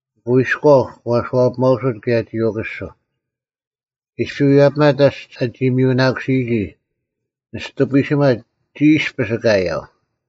ᐊᑯ ᐃᔎᐤ ᒂ ᐊᓱᐛᐱᒪᐅᓱᑦ ᑭᔭ ᒋ ᐅᑯᓱᐤ᙮ ᐃᔅᐱ ᐎᔭᐱᒪᑦ ᓇᔅᒡ ᐊᒋ ᒥᔪᓇᑯᓯᔨᒋ, ᓂᔅᑐ ᐱᓯᒺ ᒋ ᐃᔅᐱᔅ ᑲᔭᐤ᙮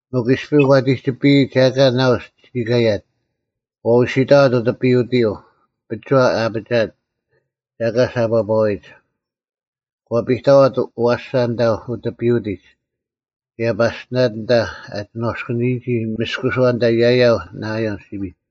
ᒥᒄ ᐃᔅᐱ ᐛᑎᒋᐱᔨᒡ ᒐ ᐊᑲ ᓇᐅᔅ ᒋ ᑲᔭᑦ, ᒂ ᐅᓯᑕᐛᑦ ᐅᑎᐱᐅᑎᔪᐤ ᐱᒍᐛ ᐊᐱᒋᐊᑦ ᒐ ᐊᑲ ᓴᑈᐸᐛᔨᒡ᙮ ᒂ ᐱᑕᐛᑦ ᐊᐛᓴ ᐊᓐᑕ ᐅᑎᐱᐅᑎᒡ ᑭᔭ ᐸᔅᑎᓇᑦ ᐊᓐᑕ ᐊ ᒋᓏᔅᑯᓂᔨᒋ ᒥᔅᑯᓱᐛ ᐊᓐᑕ ᔭᔭᐤ ᓇᐃᔭᓪ ᓯᐱᔪᐤ᙮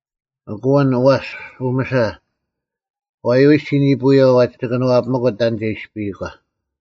ᐊᑯ ᐊᓐ ᐊᐛᔅ ᐅᒥᓴ, ᐛᔪᐎᔅ ᒋ ᓂᐳᔪᐛ ᐛᒋ ᑭᓄᐛᐱᒪᑯᑦ ᑕᓐ ᒐ ᐃᔅᐱᔨᒂ᙮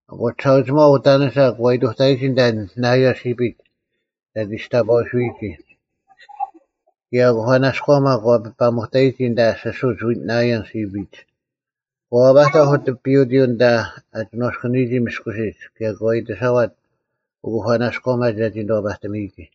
ᐊᑯ ᒋᓴᐅᒋᒪᐤ ᐅᑕᓂᓴ ᒂ ᐃᑐᑕᔨᒋ ᐊᓐᑕ ᓇᐃᔭᓪ ᓯᐱᒡ ᒐ ᒋᔅᑕᐸᐅᐎᓱᔨᒋ, ᑭᔭ ᐅᑯᐸᓇᔎᒪ ᒂ ᐱᐸᒧᑕᔨᒋ ᐊᓐᑕ ᓯᓱᒡ ᓇᐃᔭᓪ ᓯᐱᒡ᙮ ᒂ ᐛᐸᑕᐧᒃ ᐅᑎᐱᐅᑎᔪᐤ ᐊᓐᑕ ᐊ ᒋᓏᔅᑯᓂᔨᒋ ᒥᔅᑯᓯᒡ ᑭᔭ ᒂ ᐃᑎᓴᐛᑦ ᐅᑯᐸᓇᔎᒪ ᒐᒋ ᓂᑐᐛᐸᑎᒥᔨᒋ᙮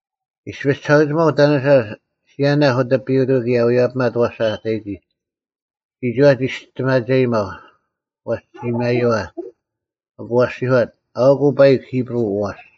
ᐃᔅᐱ ᒋᓴᐅᒋᒪᐤ ᐅᑕᓂᓴ ᓯᔭᓇᐧᒃ ᐅᑎᐱᐅᑎᔪᐤ ᑭᔭ ᐎᔭᐱᒪᑦ ᐊᐛᓴ ᐊ ᑕᔨᒋ᙮ ᒋᒋᐛ ᒋᔅᑎᒪᒐᔨᒪᐤ, ᐛᔅ ᒋ ᒪᔪᐛ᙮ ᐊᑯ ᐊᔅᒋᔄᑦ, “ᐊᐅᑯᐤ ᐸᐃᒄ ᐃᑉᕈᐤ ᐊᐛᔅ!”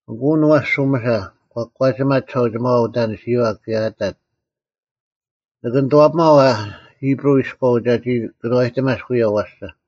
ᐊᑯ ᐊᓐ ᐊᐛᔅ ᐅᒥᓴ ᑲ ᑯᒂᒋᒪᑦ ᒋᓴᐅᒋᒪᐛ ᐅᑕᓂᓯᔪᐛ ᑭᔭ ᐊᑕᑦ, “ᓂᑭ ᓂᑐᐛᐱᒪᐤ ᐊ ᐃᑉᕈᐤ ᐃᔎᐤ ᒐᒋ ᑭᓄᐛᔨᑎᒪᔅᒃ ᐅᔭ ᐊᐛᓴ?”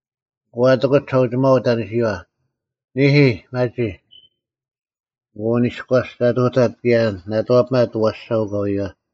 ᐊᑯ ᐊᑎᑯᑦ ᒋᓴᐅᒋᒪᐛ ᐅᑕᓂᓯᔪᐛ, “ᓂᐦᐃ, ᒪᒋ᙮” ᐊᑯ ᐊᓐ ᐃᔎᔅ ᒐ ᑐᑕᑦ ᑭᔭ ᓇᑐᐛᐱᒪᑦ ᐊᐛᓴ ᐅᑲᐎᔪᐛ᙮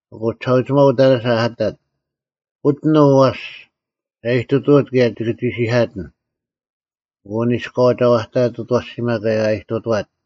ᐊᑯ ᒋᓴᐅᒋᒪᐤ ᐅᑕᓂᓴ ᐊᑕᑦ, “ᐅᑎᓐ ᐅ ᐊᐛᔅ, ᒐ ᐃᑐᑐᐅᑦ ᑭᔭ ᒋᑭ ᒋᓯᐧᑲᑎᓐ᙮” ᐊᑯ ᐊᓐ ᐃᔎᐤ ᒐ ᐛᑕᐊᑦ ᐅᑦ ᐊᐛᓯᒪ ᑭᔭ ᐊ ᐃᑐᑐᐛᑦ᙮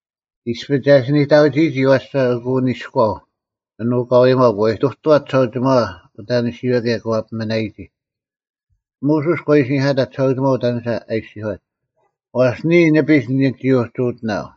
ᐃᔅᐱ ᒐ ᐃᓯ ᓂᑕᐅᒋᔨᒋ ᐊᐛᓴ, ᐊᑯ ᐊᓐ ᐅᑲᐎᒪᐤ ᒂ ᐃᑐᑐᐛᑦ ᒋᓴᐅᒋᒪᐛ ᐅᑕᓂᓯᔨᐛ ᑭᔭ ᒂ ᐱᒥᓇᔨᒋ᙮ ᒧᓱᔅ ᒂ ᐃᓯᓂᐧᑲᑕᑦ ᒋᓴᐅᒋᒪᐤ ᐅᑕᓂᓴ ᐊ ᐃᔅᒋᔄᑦ, “ᐛᔅ ᓂᔾ ᓂᐱᒡ ᓂᒋ ᐅᒋ ᐅᑎᓇᐤ᙮”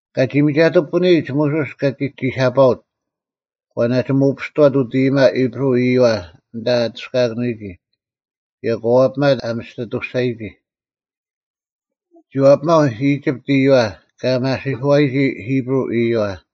ᑲᒋ ᒥᒐᑐᐱᐳᓂᔨᒡ, ᒧᓱᔅ ᑲᒋ ᒋᓴᐸᐅᑦ, ᒂ ᓇᒋ ᒧᐱᔅᑐᐛᑦ ᐅᑦ ᐃᔨᒪ ᐃᑉᕈᐤ ᐃᔪᐛ ᐊᓐᑕ ᐊᑐᔅᑲᐊᑭᓂᔨᒋ, ᑭᔭ ᒂ ᐛᐱᒪᑦ ᐊ ᒥᔅᑎᑐᔅᒐᔨᒋ᙮ ᒋ ᐛᐱᒪᐤ ᐃᒋᑉᑦ ᐃᔪᐛ ᑲ ᒪᓯᐧᑯᐛᔨᒋ ᐃᑉᕈᐤ ᐃᔪᐛ᙮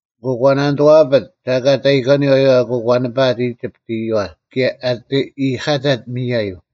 ᐊᑯ ᒂ ᓇᓂᑐᐛᐱᑦ ᒐ ᐊᑲ ᑕᔨᒂᓂ ᐊᐛᔪᐛ ᐊᑯ ᒂ ᓂᐸᐊᑦ ᐃᒋᑉᑦ ᐃᔪᐛ ᑭᔭ ᐊᑎ ᐃᔨᑲᑕᑦ ᒥᔭᔪᐤ᙮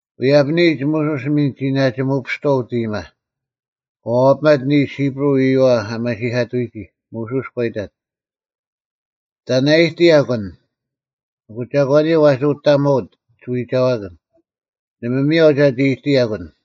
ᐎᔭᐱᓂᔨᒡ, ᒧᓱᔅ ᒥᓐ ᒋ ᓇᒋ ᒧᐱᔅᑐᐛᐤ ᐅᑦ ᐃᔨᒪ, ᒂ ᐛᐱᒪᑦ ᓂᓱ ᐃᑉᕈᐤ ᐃᔪᐛ ᐊ ᒪᓯᐧᑲᑐᔨᒋ᙮ ᒧᓱᔅ ᑲ ᐃᑕᑦ, “ᑕᓐ ᐊ ᐃᑎᔭᒄ ᐊᓐ? ᐊᑯ ᒐᒂᓂᔪᐤ ᐛᒋ ᐅᑕᒧᐅᑦ ᒋᐎᒐᐛᑭᓐ? ᓇᒪ ᒥᔽᐤ ᒐᒋ ᐃᑐᑕᔭᒄ ᐊᓐ᙮”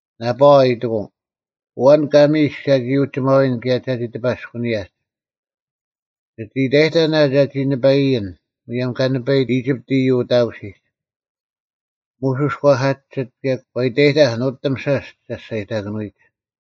ᓇᐸᐛ ᐃᑎᑯᐤ, “ᐊᐛᓐ ᑲ ᒥᔨᔅᒃ ᒐᒋ ᐅᒋᒪᐎᓐ ᑭᔭ ᒐᒋ ᑎᐸᔅᑯᓂᔭᒡ? ᒋᑦ ᐃᑕᔨᑕᓐ ᐊ ᒐᒋ ᓂᐸᐃᔨᓐ ᒧᔭᒻ ᑲ ᓂᐸᐃᑦ ᐃᒋᑉᑦ ᐃᔪᐤ ᐅᑕᑯᓯᒡ?” ᒧᓱᔅ ᒂ ᓴᒋᓯᑦ ᑭᔭ ᒂ ᐃᑕᔨᑕᐧᒃ ᓄᑎᒻ ᓴᔅ ᒐᔅᒐᔨᑕᑭᓄᐎᒡ᙮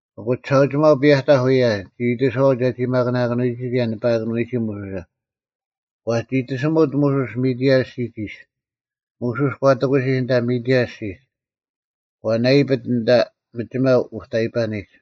ᐊᑯ ᒋᓴᐅᒋᒪᐤ ᐱᔭᑕᐧᒃ ᐅᔭ, ᒋ ᐃᑎᓱᐛᐤ ᒐᒋ ᒪᑯᓇᑭᓄᔨᒋ ᑭᔭ ᓂᐸᐊᑭᓄᔨᒋ ᒧᓱᓴ᙮ ᒂ ᒋᑎᓯᒪᑦ ᒧᓱᔅ ᒥᑎᐊᓐ ᐊᔅᒋᒡ ᐃᔅ᙮ ᒧᓱᔅ ᑲ ᑎᑯᓯᒃ ᐊᓐᑕ ᒥᑎᐊᓐ ᐊᔅᒋᒡ, ᒂ ᓇᐃᐱᑦ ᐊᓐᑕ ᒥᒋᒪ ᐅᑕᐃᐸᓂᒡ᙮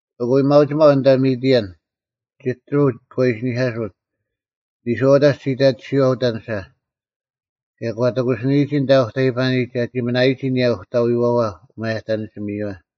ᐊᑯ ᐊᔭᒥᐊᐅᒋᒪᐤ ᐊᓐᑕ ᒥᑎᐊᓐ, ᒐᑎᕈᐤ ᑲ ᐃᓯᓂᐧᑲᓱᑦ, ᓂᔄᐅᑕᒡ ᒋ ᐃᑕᑎᓯᔪᐛ ᐅᑕᓂᓴ, ᑭᔭ ᒂ ᑎᑯᓯᓂᔨᒋ ᐊᓐᑕ ᐅᑕᐃᐸᓂᒡ ᒐᒋ ᒥᓇᔨᒋ ᐊᓂᔭ ᐅᑕᐎᐛᐛ ᐅᒪᔭᑕᓂᓯᒥᔪᐛ᙮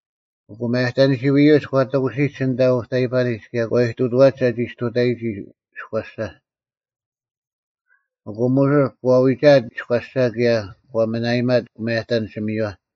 ᐊᑯ ᒪᔭᑕᓂᓯᐅ-ᐃᔪᒡ ᒂ ᑎᑯᓯᓂᒡ ᐊᓐᑕ ᐅᑕᐃᐸᓂᒡ ᑭᔭ ᒂ ᐃᑐᑐᐛᒡ ᒐᒋ ᔅᑐᑕᔨᒋ ᐃᔎᓴ, ᐊᑯ ᒧᓱᔅ ᒂ ᐎᒐᐊᑦ ᐃᔎᓴ ᑭᔭ ᒂ ᒥᓇᐃᒪᑦ ᐅᒪᔭᑕᓂᓯᒥᔪᐛ᙮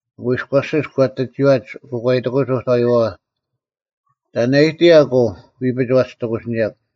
ᐊᑯ ᐃᔎᓯᒡ ᒂ ᐊᑎ ᒋᐛᒡ, ᐊᑯ ᒂ ᐃᑎᑯᒡ ᐅᑕᐎᐛᐛ, “ᑕᓐ ᐊ ᐃᑎᔭᒄ ᐅ ᐎᐱᒡ ᐛᒋ ᑎᑯᓯᓂᔭᒄ?”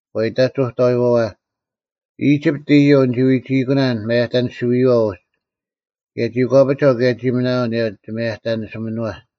ᒂ ᐃᑕᒡ ᐅᑕᐎᐛᐛ, “ᐃᒋᑉᑦ ᐃᔪᐤ ᓂᒋ ᐎᒋᐃᑯᓇᓐ ᒪᔭᑕᓂᓯᐅ-ᐃᔪᐛ ᐅᒡ, ᑭᔭ ᒋ ᒂᐱᒐᐤ ᑭᔭ ᒋ ᒥᓇᐊᐤ ᐊᓂᔭ ᒋᒪᔭᑕᓂᓯᒥᓄᐛ᙮”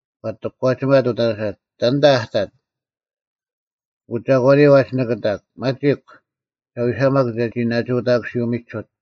ᒂ ᐊᑎ ᑯᒂᒋᒪᑦ ᐅᑕᓂᓴ, “ᑕᓐᑕ ᐊ ᑕᑦ? ᐊᑯ ᒐᒂᓂᔪᐤ ᐛᒋ ᓂᑭᑕᒄ? ᒪᒋᒄ, ᒐ ᐎᓴᒪᒄ ᒐᒋ ᓇᒋ ᐅᑕᑯᓯᐅᒥᒋᓱᑦ᙮”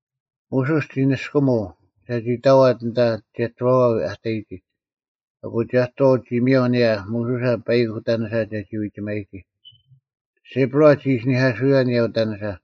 ᒧᓱᔅ ᒋ ᓂᔅᑯᒧᐤ ᒐᒋ ᑕᐛᑦ ᐊᓐᑕ ᒐᑎᕈᐛ ᐊ ᑕᔨᒋ᙮ ᐊᑯ ᒐᑎᕈᐤ ᒋ ᒥᔭᐤ ᐊᓂᔭ ᒧᓱᓴ ᐸᐃᒄ ᐅᑕᓂᓴ ᒐᒋ ᐎᒋᒪᔨᒋ᙮ ᓯᐳᕋ ᒋ ᐃᓯᓂᐧᑲᓱᔨᐛ ᐊᓂᔭ ᐅᑕᓂᓴ᙮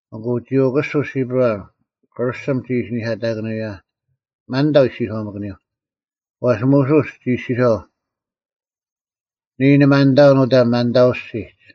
ᐊᑯ ᒋ ᐅᑯᓱᐤ ᓯᐳᕋ, ᑭᕐᓱᒻ ᒋ ᐃᓯᓂᐧᑲᑕᑭᓂᔨᐛ, (ᒪᓐᑕᐤ ᐃᔅᒋᔄᒥᑯᓂᔪᐤ) ᐛᔅ ᒧᓱᔅ ᒋ ᐃᔅᒋᔄᐤ, “ᓂᔾ ᓂ ᒪᓐᑕᐅᓐ ᐅᑕ ᒪᓐᑕᐤ ᐊᔅᒋᒡ᙮”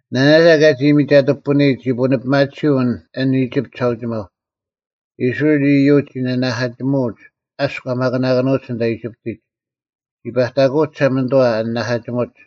ᓇᓇᒐ ᑲᒋ ᒥᒐᑐᐱᐳᓂᒡ ᒋ ᐳᓂᐱᒪᑎᓯᐤ ᐊᓐ ᐃᒋᑉᑦ ᒋᓴᐅᒋᒪᐤ, ᐃᔅᕋᐃᓪ ᐃᔪᒡ ᒋ ᓂᓇᐧᑲᒋᒧᐅᒡ ᐊᔅᒄ ᐊ ᒪᑯᓇᑭᓄᐅᒡ ᐊᓐᑕ ᐃᒋᑉᑎᒡ᙮ ᒋ ᐸᑕᑯᐅᒡ ᒋᓴᒪᓂᑐᐛ ᐊ ᓂᓇᐧᑲᒋᒧᒡ᙮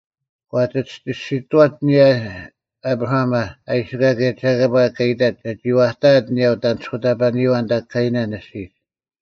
ᒂ ᐊᑎ ᒋᔅᒋᑐᐛᑦ ᐊᓂᔭ ᐊᑉᕋᐊᒪ, ᐊᐃᓯᑲ ᑭᔭ ᒐᑭᐸ ᑲ ᐃᑕᑦ ᒐ ᒋᐛᑕᐊᑦ ᐊᓂᔭ ᐅᑦ ᐊᓂᔅᑯᑕᐸᓂᔪᐛ ᓇᑕ ᑲᐃᓇᓐ ᐊᔅᒋᒡ᙮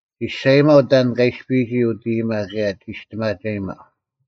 ᒋᔅᒐᔨᒪᐤ ᑕᓐ ᑲ ᐃᔅᐱᔨᒋ ᐅᑦ ᐃᔨᒪ ᑭᔭ ᒋᔅᑎᒪᒐᔨᒪᐤ᙮